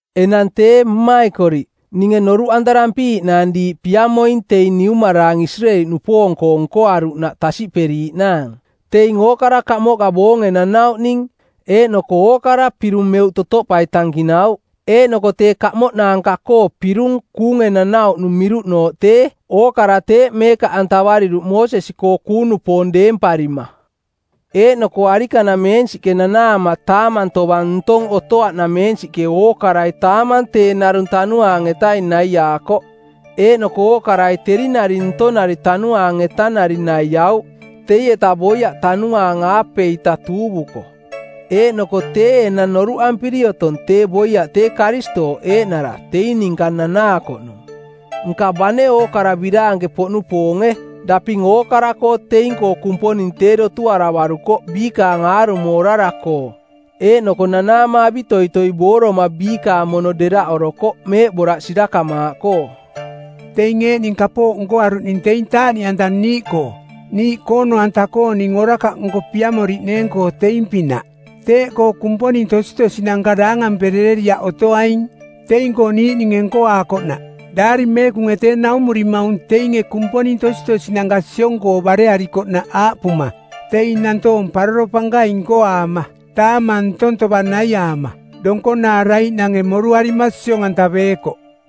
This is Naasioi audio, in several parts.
Enang tee mmaikoriꞌ, ninge noruꞌantarampiiꞌnaang diiꞌ piamoing teing niumaraang Isireeli-nupoong-koo nkoaruꞌnaꞌ tasiꞌperiiꞌnaang. Teing ookara kamoꞌka boonge nanauꞌning, eeꞌnoko ookara pirung meuꞌ totoꞌpai tankinauꞌ. Eeꞌnoko tee kamoꞌnaanka-koo pirung kuunge nanauꞌnung miruꞌnooꞌ tee ookara teeꞌ meekaꞌantavariruꞌ Moosesi-koo kuung-nupoong deemparima. Eeꞌnoko arikanameensiꞌke nanaama taamang tovang ntong otoaꞌnameensiꞌke ookarai taamang tee narung Tanuaang-etaing naiaakoꞌ. Eeꞌnoko ookarai teri nari ntonari Tanuaang-etanari naiauꞌ, teieta boiaꞌ Tanuaang-aapeita tuuvuko. Eeꞌnoko tee enang noruꞌampiri otong tee boiaꞌ tee Karistooꞌ eeꞌnara teing ninka nanaakoꞌnung. Nka, bane ookara biraanke-poꞌnupoonge, daping ookara-koo teing-koo Kumponing tee dotuaravarukoꞌ biikaang aarumo orara-koo, eeꞌnoko nanaama avitoitoi booroma biikaang mono deraꞌorokoꞌ meeꞌboraꞌ sirakamaaꞌkoo. Teing eeꞌning kapooꞌ nkoaruꞌning teing taaꞌniꞌanta niiꞌkoo niiꞌ koono-anta-kooning orakaꞌnko piamoriꞌneeng-koo teing-pinaꞌ. Teeꞌkoo kumponing tositosinanka daangamperereriaꞌ otoaing teing-koo niiꞌninge nkoaakoꞌnaꞌ. Daari Meekunge tee naumurimaung teinge kumponing tositosinanka siong-koo barearikoꞌnaꞌ aaꞌpuma, “Teing nantoong paroro pankaing nkoaama, taamang ntong tovang naiaama, donkonaaraiꞌnange moruarima siong-antaveekoꞌ.”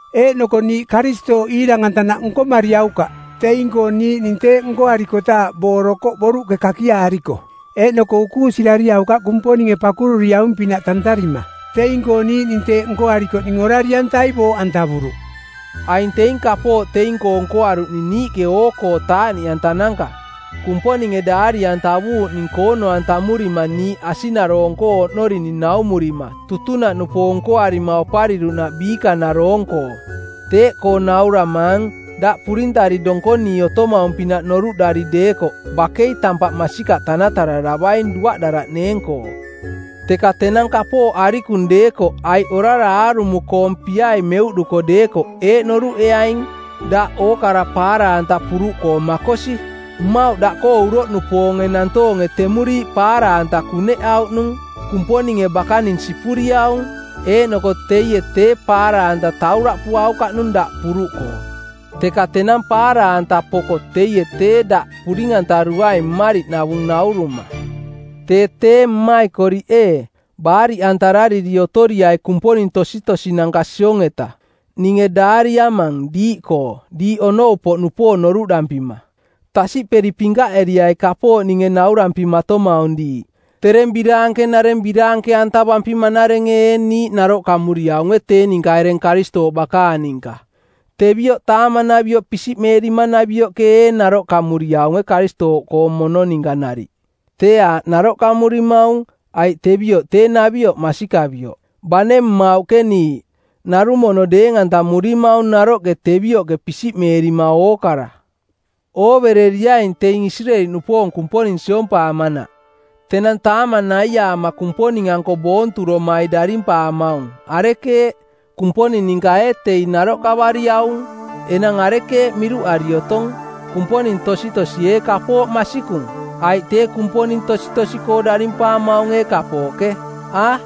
Eeꞌnoko niiꞌ Karistooꞌ iirang-antanaꞌ nkomariaukaꞌ. Teing-koo niiꞌning teeꞌ nkoarikotaaꞌ boorokoꞌ boruꞌke kakiaariko. Eeꞌnoko ukuusirariaukaꞌ Kumponinge pakururiaung-pinaꞌ tantarima. Teing-koo niiꞌning teeꞌ nkoarikoꞌning Orari-antai booꞌantavuruꞌ. Aing teing kapooꞌ teing-koo nkoaruꞌning niiꞌke oo-koo taaꞌniꞌantananka, Kumponinge daari-antavuuꞌning koono-antamurima niiꞌ asiꞌnaroong-koo oꞌnorining naumurima tutunaꞌnupoong nkoarima opariruꞌnaꞌ biikanaroong-koo. Teeꞌkoo nauramaang, daꞌ purintari donkonii otomaung-pinaꞌ noruꞌdari deekoꞌ bakei tampaꞌ masikaꞌ tanatararavaing duaꞌdaraꞌneeng-koo. Teka tenang kapooꞌ arikung deekoꞌ aiꞌ orara aarumo-koong piai meuꞌduko deekoꞌ eeꞌ noruꞌeaing: daꞌ ookara paara-anta puruꞌkoo makosi. Mmauꞌ daꞌkoo uroꞌnupoonge nantoonge temuriiꞌ paara-anta kuneꞌauꞌnung. Kumponinge bakaning sipuriaung, eeꞌnoko teie tee paara-anta tauraꞌpuaukaꞌnung daꞌ puruꞌkoo, teka tenang paara-anta poko teie tee daꞌ puring-antaruaing mmariꞌnavung nauruma. Tee tee mmaikoriꞌ ee, baariꞌantarariri otoriai kumponing tositosinanka siong-eta. Ninge daariamang diiꞌkoo diiꞌ onou-poꞌnupoong noruꞌdampima. Tasiꞌperi pinkaꞌeriai kapooꞌ ninge naurampimatomaung diiꞌ. Tereng biraanke-nareng biraanke-antavampima-narenge ee niiꞌ naroꞌkamuriaunge tee ninka ereng Karistooꞌ bakaang ninka? Tevioꞌ taamanavioꞌ pisiꞌmeerimanavioꞌke ee naroꞌkamuriaunge Karistooꞌkoo mono ninka nariꞌ? Tee aaꞌ naroꞌkamurimaung, aiꞌ tevioꞌ tee navioꞌ masikavioꞌ. Bane mmauꞌke niiꞌ, narung mono deeng-antamurimaung naroꞌke tevioꞌke pisiꞌmeerima ookara. Oovereriaing teing Isireeli-nupoong Kumponing siompaamanaꞌ. Tenang taamang naiaama Kumponing-anko boonturomai darimpaamaung, arekeeꞌ, Kumponing ninka ee teing naroꞌkavariaung? Enang arekeeꞌ miruꞌari otong? Kumponing tositosi ee kapooꞌ masikung? Aiꞌ tee kumponing tositosi-koo darimpaamaung ee kapooꞌke? A,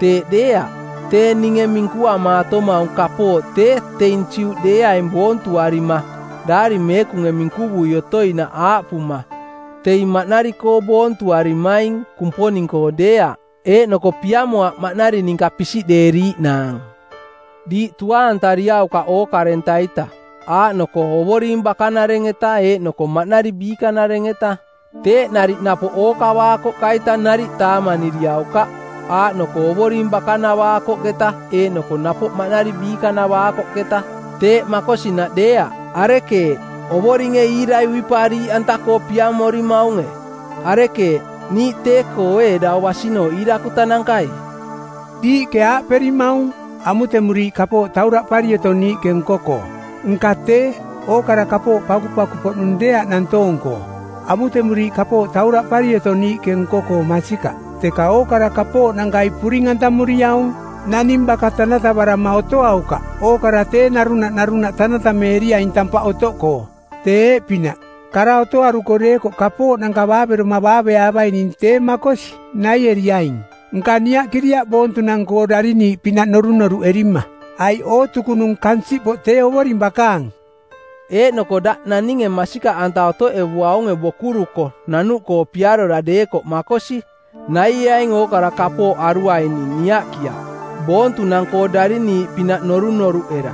teeꞌ deeaꞌ. Tee ninge minkuamaatomaung kapooꞌ tee teing Juꞌdeeaing boontuarima, Daari Meekunge minkuvui otoinaꞌ aaꞌpuma, “Teing maꞌnari-koo boontuarimaing, Kumponing-koo deeaꞌ.” Eeꞌnoko piamoaꞌ maꞌnari ninka pisiꞌdeeriiꞌnaang. Diiꞌ tuaantariaukaꞌ ookarenta-ita, aaꞌnoko Ovoring bakanareng-eta eeꞌnoko maꞌnari biikanareng-eta. Teeꞌ nariꞌ napoꞌ ookavaakoꞌka-ita nariꞌ taamaniriaukaꞌ, aaꞌnoko Ovoring bakanavaakoꞌketa eeꞌnoko napoꞌ maꞌnari biikanavaakoꞌketa. Teeꞌ makosinaꞌ deeaꞌ. Arekeeꞌ, Ovoringe iirai uipaariiꞌanta-koo piamorimaunge? Arekeeꞌ, niiꞌ tee-koo ee dau basinooꞌ iirakutanankai? Diiꞌke aaꞌperimaung, “Amutemuriiꞌ kapooꞌ tauraꞌpari otong niiꞌke nko-koo.” Nka tee, ookara kapooꞌ pakupaku-poꞌnung deeaꞌ nantoong-koo. Amutemuriiꞌ kapooꞌ tauraꞌpari otong niiꞌke nko-koo masikaꞌ, teka ookara kapooꞌnankai puring-antamuriaung. Naning baka tanatavarama otoaukaꞌ. Ookara tee narunaꞌ narunaꞌ tanatameeriaing tampaꞌ otoꞌkoo. Tee eeꞌpinaꞌ: Kara otoaruko deekoꞌ kapooꞌnanka baaveroma baaveaavaining tee makosi, naieriaing, nka niaꞌkiriaꞌ boontunang-koo dariniiꞌpinaꞌ norunoruꞌerima. Aiꞌ “Ootukunung kansiꞌpoꞌ tee Ovoring bakaang.” Eeꞌnoko daꞌ naninge masikaꞌanta otoꞌevuaunge bokuruko nanuꞌkoo piarora deekoꞌ makosi, naieaing ookara kapooꞌ aruaining niaꞌkiaꞌ boontunang-koo dariniiꞌpinaꞌ norunoruꞌera.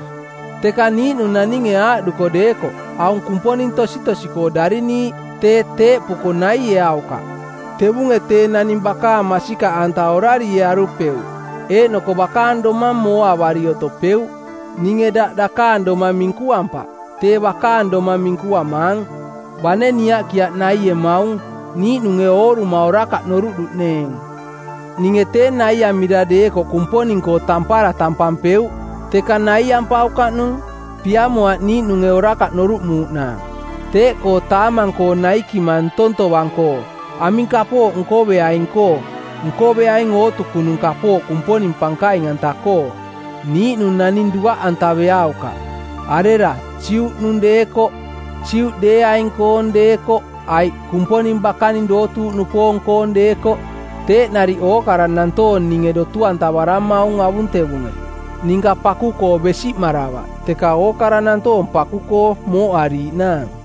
Teka niiꞌnung naninge aaꞌduko deekoꞌ, “Aung kumponing tositosi-koo dariniiꞌ,” tee, teeꞌpuko naieaukaꞌ. Tevunge tee naning bakaang masikaꞌanta orariearupeuꞌ eeꞌnoko bakaang domang mooavari otopeuꞌ. Ninge daꞌ dakaang domang minkuampaꞌ, tee bakaang domang minkuamaang. Bane niaꞌkiaꞌ naiemaung, niiꞌnunge ooruma orakaꞌ noruꞌduꞌneeng. Ninge tee naiamira deekoꞌ Kumponing-koo tampara tampampeuꞌ, teka naiampaukaꞌnung. Piamoaꞌ niiꞌnunge ning orakaꞌ noruꞌmuuꞌnaang. Teeꞌkoo taamang-koo naikima ntong tovang-koo, aming kapooꞌ nkoveaing-koo, nkoveaing ootukunung kapooꞌ Kumponing pankaing-anta-koo. Niiꞌnung naning duaꞌantaveaukaꞌ, arera, Juꞌnung deekoꞌ, Juꞌdeeaing-koong deekoꞌ aiꞌ Kumponing bakaning dootuuꞌnupoong-koong deekoꞌ, teeꞌ nariꞌ ookara nantoong ninge dotu-antavaramaung avuntevunge. Ninka paku-koo besiꞌmaravaꞌ, teka ookara nantoong paku-koo mooꞌariiꞌnaang.